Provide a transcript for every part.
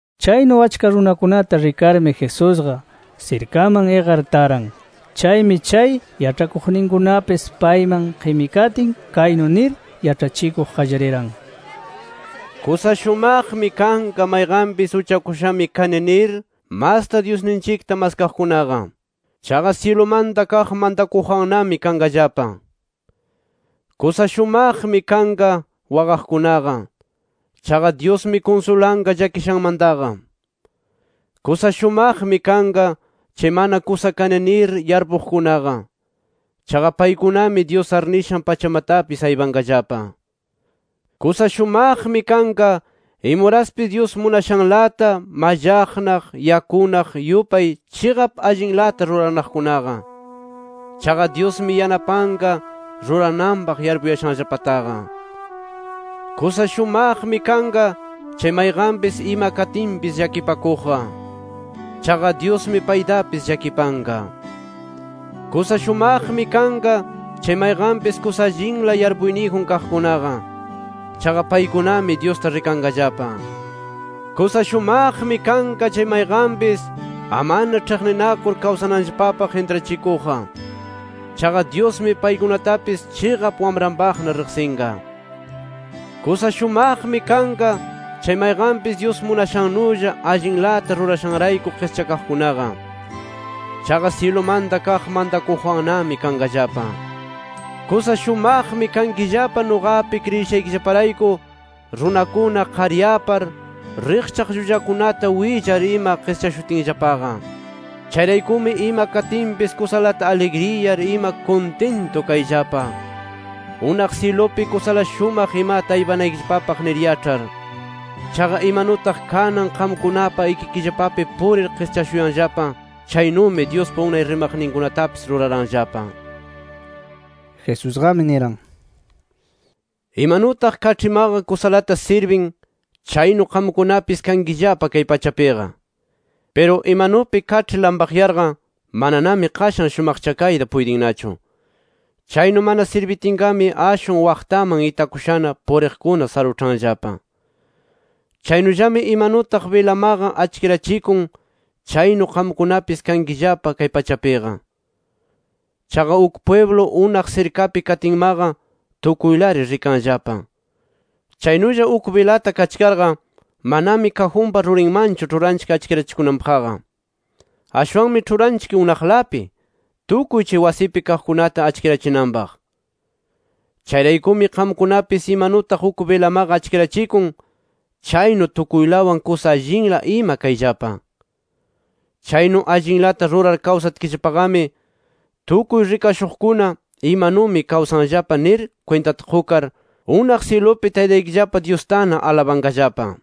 Chaynu achka runakunata rikarmi, Jesusqa sirkaman iqar taran. Chaymi chay yaĉhakuqninkunapis payman qimikatin, kaynu nir yaĉhachikuq qallariran: “Kusa shumaqmi kanqa, mayqanpis uchakushami kani nir masta Dyusninchikta maskaqkunaqa. Chaqa syilumanta kaq mantakuqwannami kanqallapa. Kusa shumaqmi kanqa, waqaqkunaqa. Chaqa Dyusmi kunsulanqa llakishanmantaqa. Kusa shumaqmi kanqa, chay mana kusa kani nir yarpuqkunaqa. Chaqa paykunami Dyus arnishan pachamatapis aypanqallapa. Kusa shumaqmi kanqa, imuraspis Dyus munashanlata mallaqnaq, yakunaq yupay chiqap allinlata ruranaqkunaqa. Chaqa Dyusmi yanapanqa rurananpaq yarpuyashanllapataqa. Kusa shumaqmi kanqa, chay mayqanpis ima katinpis llakipakuqqa. Chaqa Dyusmi paytapis llakipanqa. Kusa shumaqmi kanqa, chay mayqanpis kusa allinla yarpuyniyjun kaqkunaqa. Chaqa paykunami Dyusta rikanqallapa. Kusa shumaqmi kanqa, chay mayqanpis amana ĉhiqninakur kawsananllapapaq intrachikuqqa. Chaqa Dyusmi paykunatapis chiqap wamranpaqna riqsinqa. Kusa shumaqmi kanqa, chay mayqanpis Dyus munashannulla allinlata rurashanrayku qischakaqkunaqa. Chaqa syilumanta kaq mantakuqwannami kanqallapa. “Kusa shumaqmi kankillapa nuqapi kriyishaykillaparayku runakuna qaryapar, riqchaq llullakunata willar ima qischashutinllapaqa. Chayraykumi ima katinpis kusalata aligriyar ima kuntintu kayllapa, unaq syilupi kusala shumaq imata aypanaykillapapaq nir yaĉhar. Chaqa imanutaq kanan qamkunapa ikikillapapi purir qischashuyanllapa, chaynumi Dyuspa unay rimaqninkunatapis ruraranllapa”. Jesusqami niran: “Imanutaq kaĉhimaqa kusalata sirbin chaynu qamkunapis kankillapa kay pachapiqa. Piru imanupi kaĉhi lampaqyarqa mananami qashan shumaqchakayta puytinnachu. Chaynu mana sirbitinnaqami ashwan waqtaman itakushana puriqkuna saruĉhanllapa. “Chaynullami imanutaq bilamaqa achkirachikun chaynu qamkunapis kankillapa kay pachapiqa. Chaqa uk pwiblu unaq sirkapi katinmaqa tukuylari rikanllapa. Chaynulla uk bilata kachkarqa manami kajunpa rurinmanchu ĉhuranchik achkirachikunanpaqqa. Ashwanmi ĉhuranchik unaqlapi, tukuy chay wasipi kaqkunata achkirachinanpaq. Chayraykumi qamkunapis imanutaq uk bilamaqa achkirachikun chaynu tukuylawan kusa allinla ima kayllapa. Chaynu allinlata rurar kawsatkillapaqami, tukuy rikashuqkuna imanumi kawsanllapa nir kwintata qukar, unaq syilupi Taytaykillapa Dyustana alabanqallapa.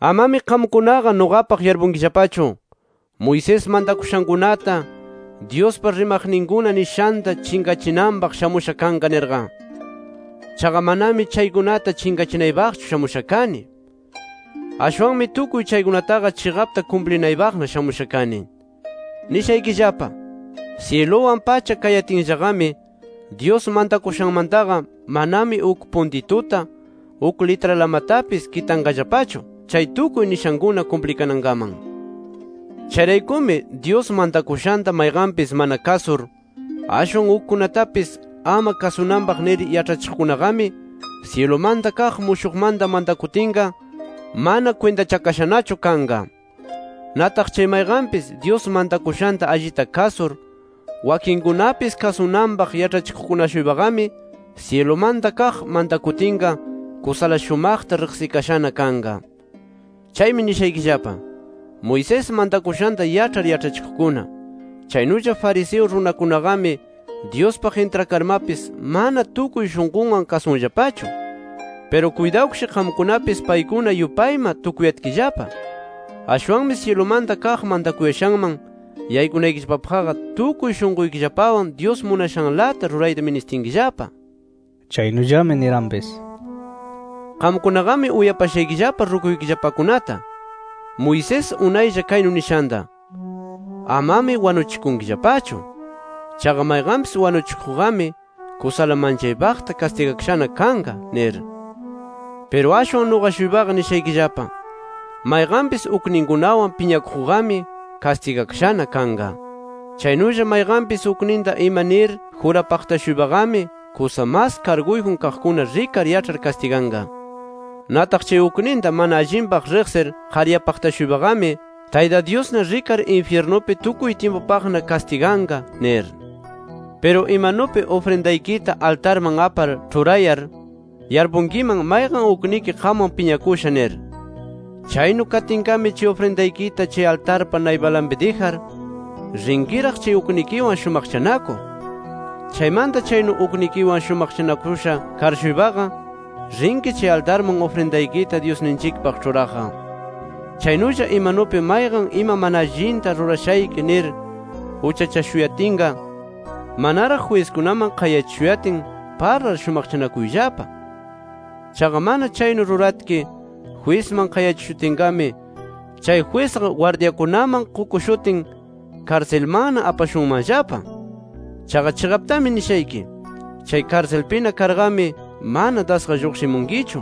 “Amami qamkunaqa nuqapaq yarpunkillapachu, Moisés mantakushankunata, Dyuspa rimaqninkuna nishanta chinqachinanpaq shamusha kanqa nirqa. Chaqa manami chaykunata chinqachinaypaqchu shamusha kani. Ashwanmi tukuy chaykunataqa chiqapta kumplinaypaqna shamusha kani. Nishaykillapa: Syiluwan pacha kayatinllaqami, Dyus mantakushanmantaqa manami uk puntituta, uk litralamatapis kitanqallapachu chay tukuy nishankuna kumplikanankaman. Chayraykumi, Dyus mantakushanta mayqanpis mana kasur ashwan ukkunatapis ama kasunanpaq nir yaĉhachiqkunaqami syilumanta kaq mushuqmanta mantakutinqa, mana kwintachakashanachu kanqa. Nataq chay mayqanpis Dyus mantakushanta allita kasur, wakinkunapis kasunanpaq yaĉhachiqkuna-shuypaqami syilumanta kaq mantakutinqa kusala shumaqta riqsikashana kanqa. Chaymi nishaykillapa: Moisés mantakushanta yaĉhar yaĉhachikuqkuna, chaynulla fariseo runakunaqami Dyuspaq intrakarmapis mana tukuy shunqunwan kasunllapachu. Piru kuytawkish qamkunapis paykuna yupayma tukuyatkillapa. Ashwanmi syilumanta kaq mantakuyashanman yaykunaykillapapaqqa tukuy shunquykillapawan Dyus munashanlata rurayta ministinkillapa”. Chaynullami niranpis: “Qamkunaqami uyapashaykillapa rukuykillapakunata Moisés unaylla kaynu nishanta: ‘Amami wanuchikunkillapachu. Chaqa mayqanpis wanuchikuqqami, kusala manchaypaqta kastigakashana kanqa’ nir. Piru ashwan nuqa-shuypaqa nishaykillapa: Mayqanpis ukninkunawan piñakuqqami kastigakashana kanqa. Chaynulla mayqanpis ukninta ima nir jurapaqta-shuypaqami kusa mas karguyjun kaqkuna rikar yaĉhar kastiganqa. Nataq chay ukninta mana allinpaq riqsir qaryapaqta-shuypaqami Tayta Dyusna rikar infyirnupi tukuy tyimpupaqna kastiganqa nir. “Piru imanupi ufrindaykita altarman apar ĉhurayar, yarpunkiman mayqan ukniki qamwan piñakusha nir. Chaynu katinqami chay ufrindaykita chay altarpa naypanlapi dijar, rinkiraq chay uknikiwan, shumaqchanakuq. Chaymanta chaynu uknikiwan shumaqchanakusha kar-shuypaqa rinki chay altarman ufrindaykita Dyusninchikpaq ĉhuraqqa. “Chaynulla imanupi mayqan ima mana allinta rurashayki nir uchachashuyatinqa, manaraq jwiskunaman qayachishuyatin parlar shumaqchanakuyllapa. Chaqa mana chaynu ruratki jwisman qayachishutinqami, chay jwisqa gwardyakunaman qukushutin karsilmanna apashunmanllapa. Chaqa chiqaptami nishayki: Chay karsilpina karqami mana dasqa lluqshimunkichu,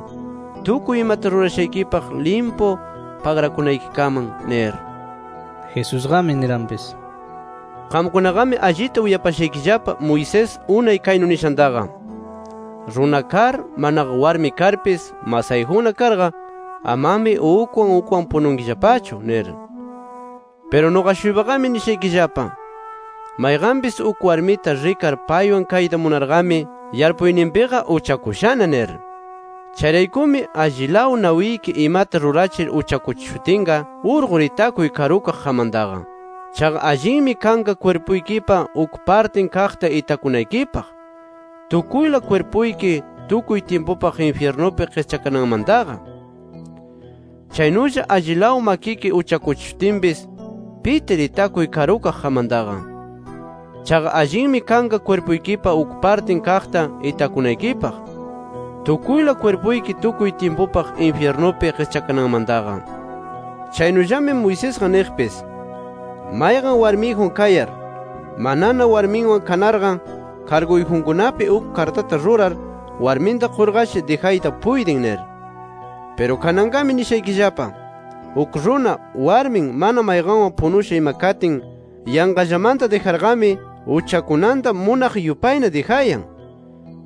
tukuy imata rurashaykipaq limpu pagrakunaykikaman nir”. Jesusqami niranpis: “Qamkunaqami allita uyapashaykillapa Moisés unay kaynu nishantaqa: ‘Runa kar, manaqa warmi karmapis masayjunna karqa, amami ukwan ukwan pununkillapachu’ nir. Piru nuqa-shuypaqami nishaykillapa: Mayqanpis uk warmita rikar paywan kayta munarqami yarpuyninpiqa uchakushana nir. “Chayraykumi, allilaw nawiki imata rikachir uchakuchishutinqa urqur itakuy karukaq qammantaqa. Chaqa allinmi kanqa kwirpuykipa uk partin kaqta itakunaykipaq tukuyla kwirpuyki tukuy tyimpupaq infyirnupi qischakananmantaqa. Chaynulla allilaw makiki uchakuchishutinpis, pitir itakuy karukaq qammantaqa. Chaqa allinmi kanqa kwirpuykipa uk partin kaqta itakunaykipaq tukuyla kwirpuyki tukuy tyimpupaq infyirnupi qischakananmantaqa. “Chaynullami Moisesqa niqpis: ‘Mayqan warmiyjun kayar, manana warminwan kanarqa karguyjunkunapi uk kartata rurar warminta qurqashi dijayta puytin’ nir. Piru kananqami nishaykillapa: Uk runa, warmin mana mayqanwan punusha ima katin yanqallamanta dijarqami, uchakunanta munaq yupayna dijayan.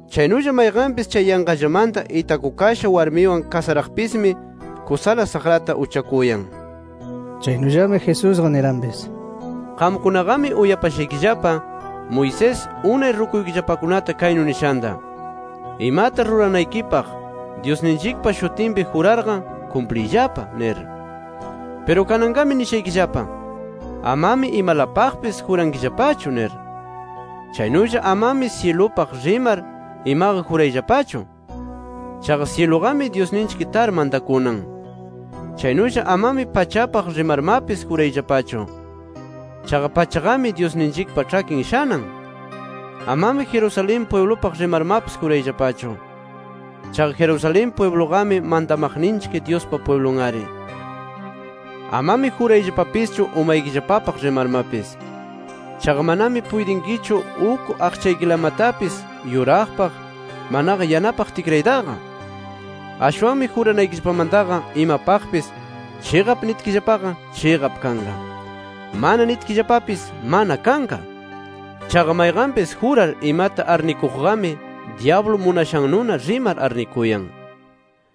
Chaynulla mayqanpis chay yanqallamanta itakukasha warmiwan kasaraqpismi kusala saqrata uchakuyan”. Chaynullami Jesusqa niranpis: “Qamkunaqami uyapashaykillapa Moisés unay rukuykillapakunata kaynu nishanta: ‘Imata ruranaykipaq Dyusninchikpa shutinpi jurarqa kumpliyllapa’ nir. Piru kananqami nishaykillapa: Amami imalapaqpis jurankillapachu nir. Chaynulla amami syilupaq rimar imaqa jurayllapachu. Chaqa syiluqami Dyusninchik tar mantakunan. Chaynulla amami pachapaq rimarmapis jurayllapachu. Chaqa pachaqami Dyusninchikpa ĉhakin shanan. Amami Jerusalén pwiblupaq rimarmapis jurayllapachu. Chaqa Jerusalén pwibluqami mantamaqninchik Dyuspa pwiblun-ari. Amami jurayllapapischu umaykillapapaq rimarpis. Chaqa manami puytinkichu uk aqchaykillapalamatapis yuraqpaq, manaqa yanapaq tikraytaqa. Ashwanmi juranaykillapamantaqa imapaqpis ‘Chiqap’ nitkillapaqa, chiqap kanqa. ‘Mana’ nitkillapapis, mana kanqa. Chaqa mayqanpis jurar imata arnikuqqami dyablu munashannuna rimar arnikuyan.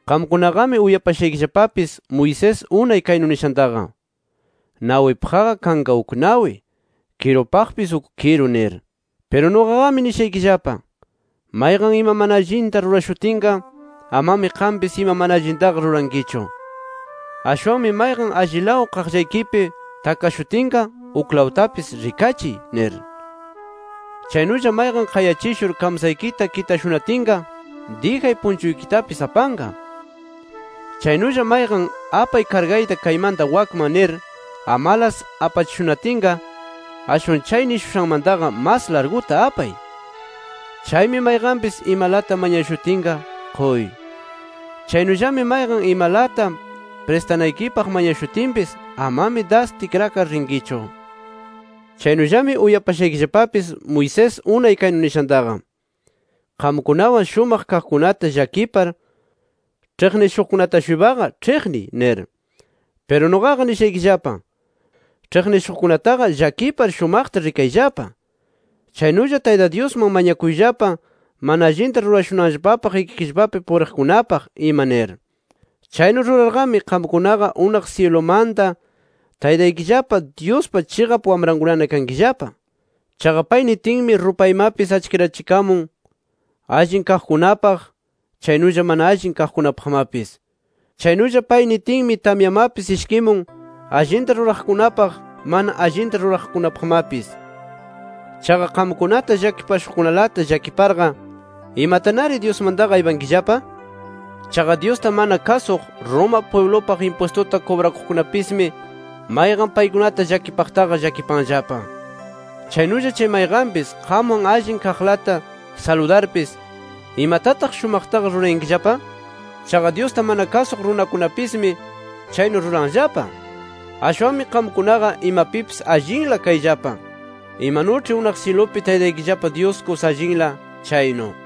“Qamkunaqami uyapashaykillapapis Moisés unay kaynu nishantaqa: ‘Nawipaqqa kanqa uk nawi. Kirupaqpis uk kiru’ nir. Piru nuqaqami nishaykillapa: Mayqan ima mana allinta rurashutinqa, amami qampis ima mana allintaqa rurankichu. Ashwanmi mayqan allilaw qaqllaykipi takashutinqa uklawtapis rikachiy nir. Chaynulla mayqan qayachishur kamsaykita kitashunatinqa, dijay punchuykitapis apanqa. Chaynulla mayqan ‘Apay kargayta kaymanta wakkaman’ nir, amalas apachishunatinqa, ashwan chay nishushanmantaqa mas larguta apay. Chaymi mayqanpis imalata mañashutinqa, quy. Chaynullami mayqan imalata pristanaykipaq mañashutinpis amami das tikrakar rinkichu. “Chaynullami uyapashaykillapapis Moisés unay kaynu nishantaqa: ‘Qamkunawan shumaq kaqkunata llakipar, ĉhiqnishuqkunata-shuypaqa ĉhiqniy’ nir. Piru nuqaqa nishaykillapa: Ĉhiqnishuqkunataqa llakipar shumaqta rikayllapa. Chaynulla Tayta Dyusman mañakuyllapa mana allinta rurashunanllapapaq ikikillapapi puriqkunapaq ima nir. Chaynu rurarqami qamkunaqa unaq syilumanta Taytaykillapa Dyuspa chiqap wamrankunana kankillapa. Chaqa pay nitinmi rupaymapis achkirachikamun allin kaqkunapaq, chaynulla mana allin kaqkunapaqmapis. Chaynulla pay nitinmi tamyamapis ishkimun allinta ruraqkunapaq, mana allinta ruraqkunapaqmapis. Chaqa qamkunata llakipashuqkunalata llakiparqa ¿imatanari Dyusmantaqa aypankillapa? Chaqa Dyusta mana kasuq, Roma pwiblupaq impwistuta kubrakuqkunapismi mayqan paykunata llakipaqtaqa llakipanllapa. Chaynulla chay mayqanpis qamwan allin kaqlata saludarpis ¿imatataq shumaqtaqa rurayankillapa? Chaqa Dyusta mana kasuq runakunapismi chaynu ruranllapa. Ashwanmi qamkunaqa imapipis allinla kayllapa imanuĉhi unaq syilupi Taytaykillapa Dyus kusa allinla chaynu”.